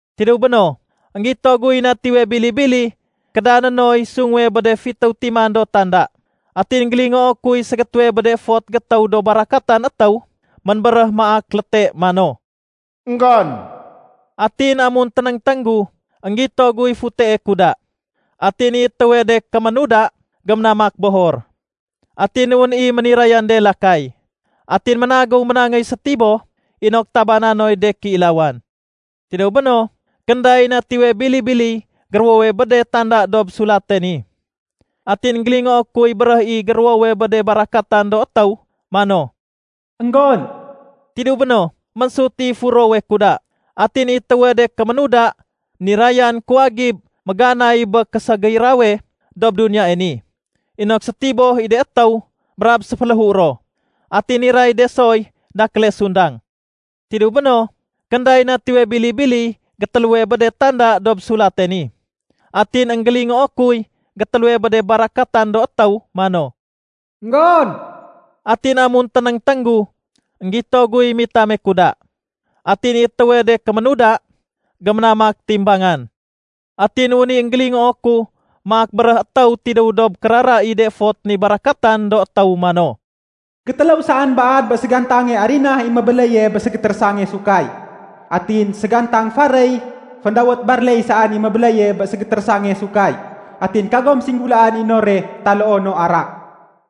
Tidéw béno, énggito guy Natiwe Bili-bili kédané noy sunguwe bé de fitéw timan do tanda. Atin énggélingoo kuy ségétéwe bé de fot gétéw do barakatan étéw ménbéréh maak léte mano, “Enggon!” Atin amun ténéngténg gu, énggito guy futee kuda. Atin i étéwe de kéménuda, géménamak bohor. Atin wén i ménirayan de lakay. Atin ménagéw ménangéy sétiboh inok tabané noy de kéilawan. Tidéw béno, kénday Natiwe Bili-biliy géruwowe bé de tanda dob sulate ni. Atin énggélingoo kuy béréh i géruwowe bé de barakatan do étéw mano, “Enggon!” Tidéw béno, ménsut i furowe kuda. Atin i étéwe de kéménuda, nirayan kuwagib méganay bé késégirawe dob duniyae ni inok sétiboh i de étéw brab séféléhu ro. Atin niray de soy dakéle sundang. Tidéw béno, kénday Natiwe Bili-biliy gétéléwe bé de tanda dob sulate ni. Atin énggélingoo kuy gétéléwe bé de barakatan do étéw mano, “Enggon!” Atin amun ténéngténg gu, énggito guy mitame kuda. Atin i étéwe de kéménuda, géménamak timbangan. Atin wén i énggélingoo ku maak béréh étéw tidéw dob kérara i de fot ni barakatan do étéw mano, “Gétéléw saén baad bé ségantange arinah i mébéléye bé ségétérésangane sahud, atin ségantang faréy féndawét ‘barley’ saén i mébéléye bé ségétérésangane sahud. Atin kagom singgulaén i nore taloo no arak.”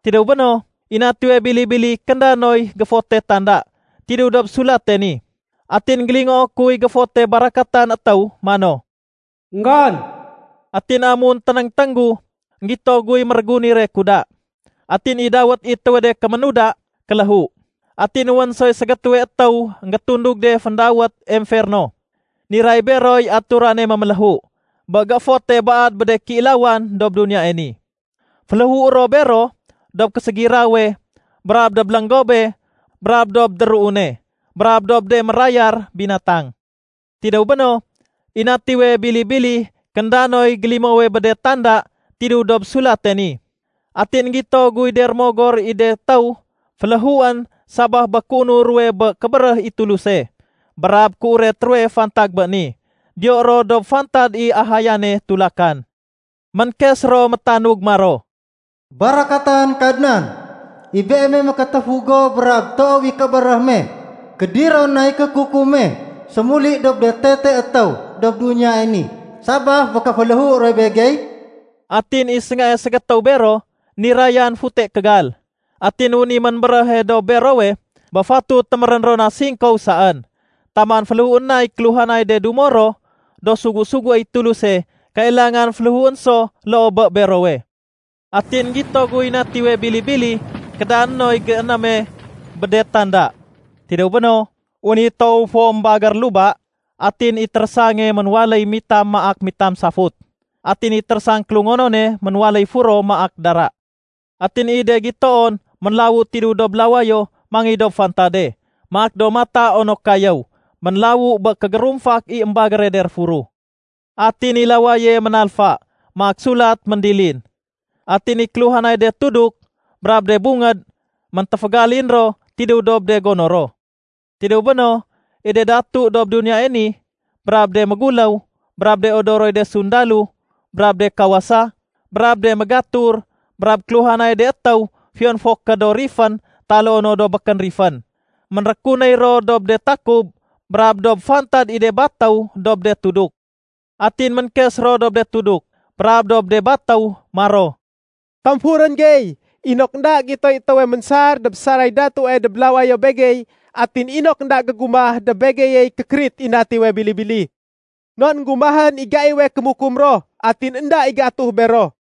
Tidéw béno, i Natiwe Bili-bili kénda noy géfote tanda tidéw dob sulate ni. Atin énggélingoo kuy géfote barakatan étéw mano, “Enggon!” Atin amun ténéngténg gu, énggito guy mérégunire kuda. Atin i dawét i étéwe de kéménuda “Kéléhu”. Atin wén soy ségétéwe étéw énggétundug de féndawét “Emferno”. Niray beroy aturane méméléhu bé géfote baad bé de kéilawan dob duniyae ni. Féléhué ro bero dob késégirawe brab dob lénggobe brab dob déruune brab dob de mérayar binatang. Tidéw béno, i Natiwe Bili-bili kénda noy gélimowe bé de tanda tidéw dob sulate ni. Atin énggito guy de rémogor i de étéw fénléhuén sabaf bé kéunur ruwe bé kébéréh i Tuluse brab kéuret ruwe fantag bé ni. Diyo ro dob fantad i ahayane tulakan. Ménkes ro métanug maro, “Barakatan Kadnan, i Beeme mékétéfu go brab toow i kébéréh me. Kédiron nay kékukum me sémuli dob de tete étéw dob duniyae ni sabaf bé kéféléhu ruwe begey?” Atin i séngae ségétéw bero nirayan fute kégal. Atin wén i ménbéréhe dob berowe bé fatut témérén ro na singkow saén taman féléhuén nay kéluhanay de dumo ro do sugu-suguéy Tuluse kailangan féléhuén so loo bé berowe. Atin énggito guy Natiwe Bili-bili kédané noy généme bé de tanda. Tidéw béno, wén i toow fo ménbagér luba, atin i térésange ménwaléy mitam maak mitam safut. Atin i térésang kélungonone ménwaléy furo maak dara. Atin i de gitoon ménlawu tidéw dob lawayo mangéy dob fantade maak do mata onok kayéw ménlawu bé kégérumfak i émbagére de réfuruh. Atin i lawaye ménalfa maak sulat méndilin. Atin i kéluhanay de tuduk brab de bungéd méntéfégalin ro tidéw dob de gono ro. Tidéw béno, i de datu dob duniyae ni, brab de méguléw, brab de odoroy de sundalo, brab de kawasa, brab de mégatur, brab kéluhanay de étéw fiyon fo ké do rifén taloo no do békén rifén, ménrékunéy ro dob de takub brab dob fantad i de batéw dob de tuduk. Atin ménkes ro dob de tuduk brab dob de batéw maro, “Tamfurén gey inok énda gitoy étéwe ménsar dob saray datue dob lawayo begey atin inok énda gégumah dob begeyey kékérit i Natiwe Bili-bili. Non énggumahén i gaiwe kémukum ro, atin énda i géatuh bero.”